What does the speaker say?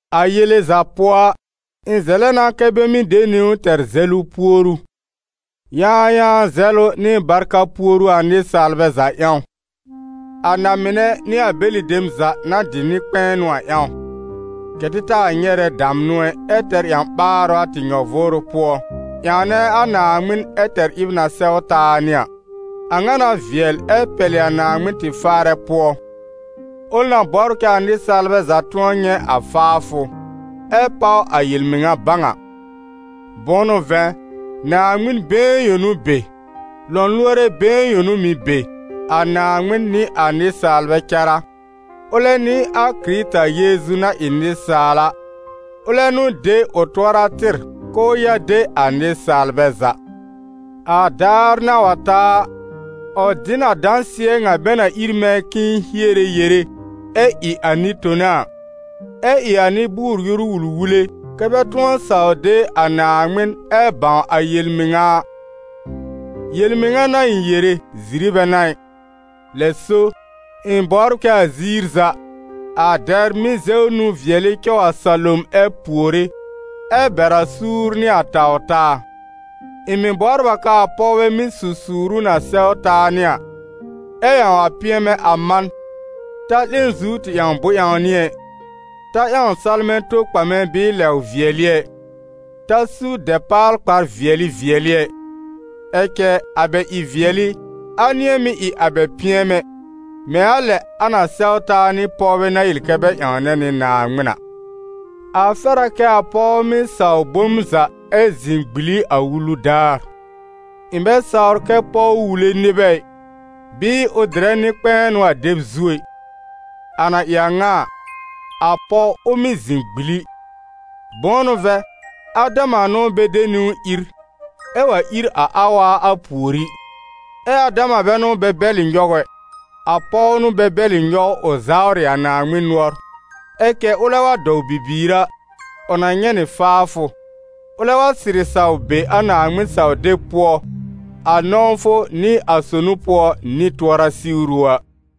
A yele za pʋɔ a, ɩ̃ zɛlɛ na kɛ́ bɛ mɩ́ de niwn tɛr zɛlʋ puoru, yãayãa zɛlʋ nɩ barka puoru a nɩsaalbɛ za ƴãw, a na-mɩnɛ nɩ a bɛlɩ dem za na dɩ nɩ-kpɛ̃ɛnʋ a ƴãw: kɛ̀ tɩ taa nyɛrɛ damnʋ ɛ, ɛ tɛr ƴã-ɓaarʋ a tɩ nyɔ-vʋʋrʋ pʋɔ, ƴãwnɛ a Naaŋmɩn ɛ tɛr ɩb na sɛw taa nɩ a. A ŋa n'a vɩɛl ɛ pɛlɩ a Naaŋmɩn tɩ Faarɛ pʋɔ, ʋl na bɔbr kɛ a nɩsaalbɛ za tʋ̃ɔ nyɛ̃ a faafʋ, ɛ páw a yel-mɩŋa bãw a. Bʋ̃ʋ n'ʋ vɛ̃, Naaŋmɩn been yõ n'ʋ be, lɔ̃lʋɔrɛ been yõ n'ʋ mɩ̀ be, a Naaŋmɩn nɩ a nɩsaalbɛ cará: ʋlɛ n'ɩ a Kɩrɩta Yeezu na ɩ nɩsaal a, ʋlɛ n'ʋ de ʋ tʋɔra tɩr k'ʋʋ ya de a nɩsaalbɛ za. A daar na wa ta a, ʋ dɩ n a dãsɩɛ ŋa bɛ na ír mɛ̃ k'ɩ̃ɩ hiere yere, ɛ ɩ a nɩ-tona a, ɛ ɩ a nɩ-bʋʋr-yoru wul-wule, kɛ́ bɛ tʋ̃ɔ saw de a Naaŋmɩn ɛ bãw a yel-mɩŋa a. Yel-mɩŋa n'a ɩ̃ yere, ziri bɛ n'a ɩ. Lɛ so, ɩ̃ bɔbr kɛ a ziir za, a dɛbr mɩ́ zɛw nũ-vɩɛlɩ cɔw a salom ɛ puore, ɛ bɛr a suur nɩ a taw-taa. Ɩ̃ mɩ̀ bɔbr a k'aa pɔwbɛ mɩ́ su suuru na sɛw taa nɩ a, ɛ ƴãw a pɩɛmɛ a man: ta 'lẽ zu tɩ ƴãw bʋ̃-ƴãwnɩ ɛ, ta ƴãw salmɛ̃ tokpamɛ bɩɩ lɛw-vɩɛlɩ ɛ, ta su dɛpaal-kpar-vɩɛlɩ vɩɛlɩ ɛ. Ɛ cɛ a bɛ ɩ-vɩɛlɩ, a nɩ̃ɛ mɩ́ ɩ a bɛ pɩɛmɛ, mɛ̃ a lɛ a na sɛw taa nɩ pɔwbɛ na yel kɛ bɛ ƴãwnɛ nɩ Naaŋmɩn a. A fɛr a kɛ a pɔw mɩ́ saw bom za ɛ zɩ̃ gbili a wulu daar. Ɩ̃ bɛ sawr kɛ pɔw wule nɩbɛ ɩ, bɩɩ ʋ dɩrɛ nɩ-kpɛ̃ɛnʋ a dɛb zu ɛ. A na ɩ a ŋa a, a pɔw, ʋ mɩ́ zɩ̃ gbili. Bʋ̃ʋ n'ʋ vɛ̃, Adama n'ʋ bɛ de niwn ír, ɛ wa ír a Awa a pùorí. Ɛ Adama bɛ n'ʋ bɛ bɛlɩ nyɔw ɛ, a pɔw n'ʋ bɛ bɛlɩ nyɔw ʋ zawrɩ a Naaŋmɩn nʋɔr. Ɛ cɛ ʋlɛ wa dɔw bibiir a, ʋ na nyɛ̃ nɩ faafʋ, ʋlɛ wa sɩrɩ saw be a Naaŋmɩn-saw-deb pʋɔ, a nɔ̃wfʋ nɩ a sonu pʋɔ nɩ tʋɔra siwru a.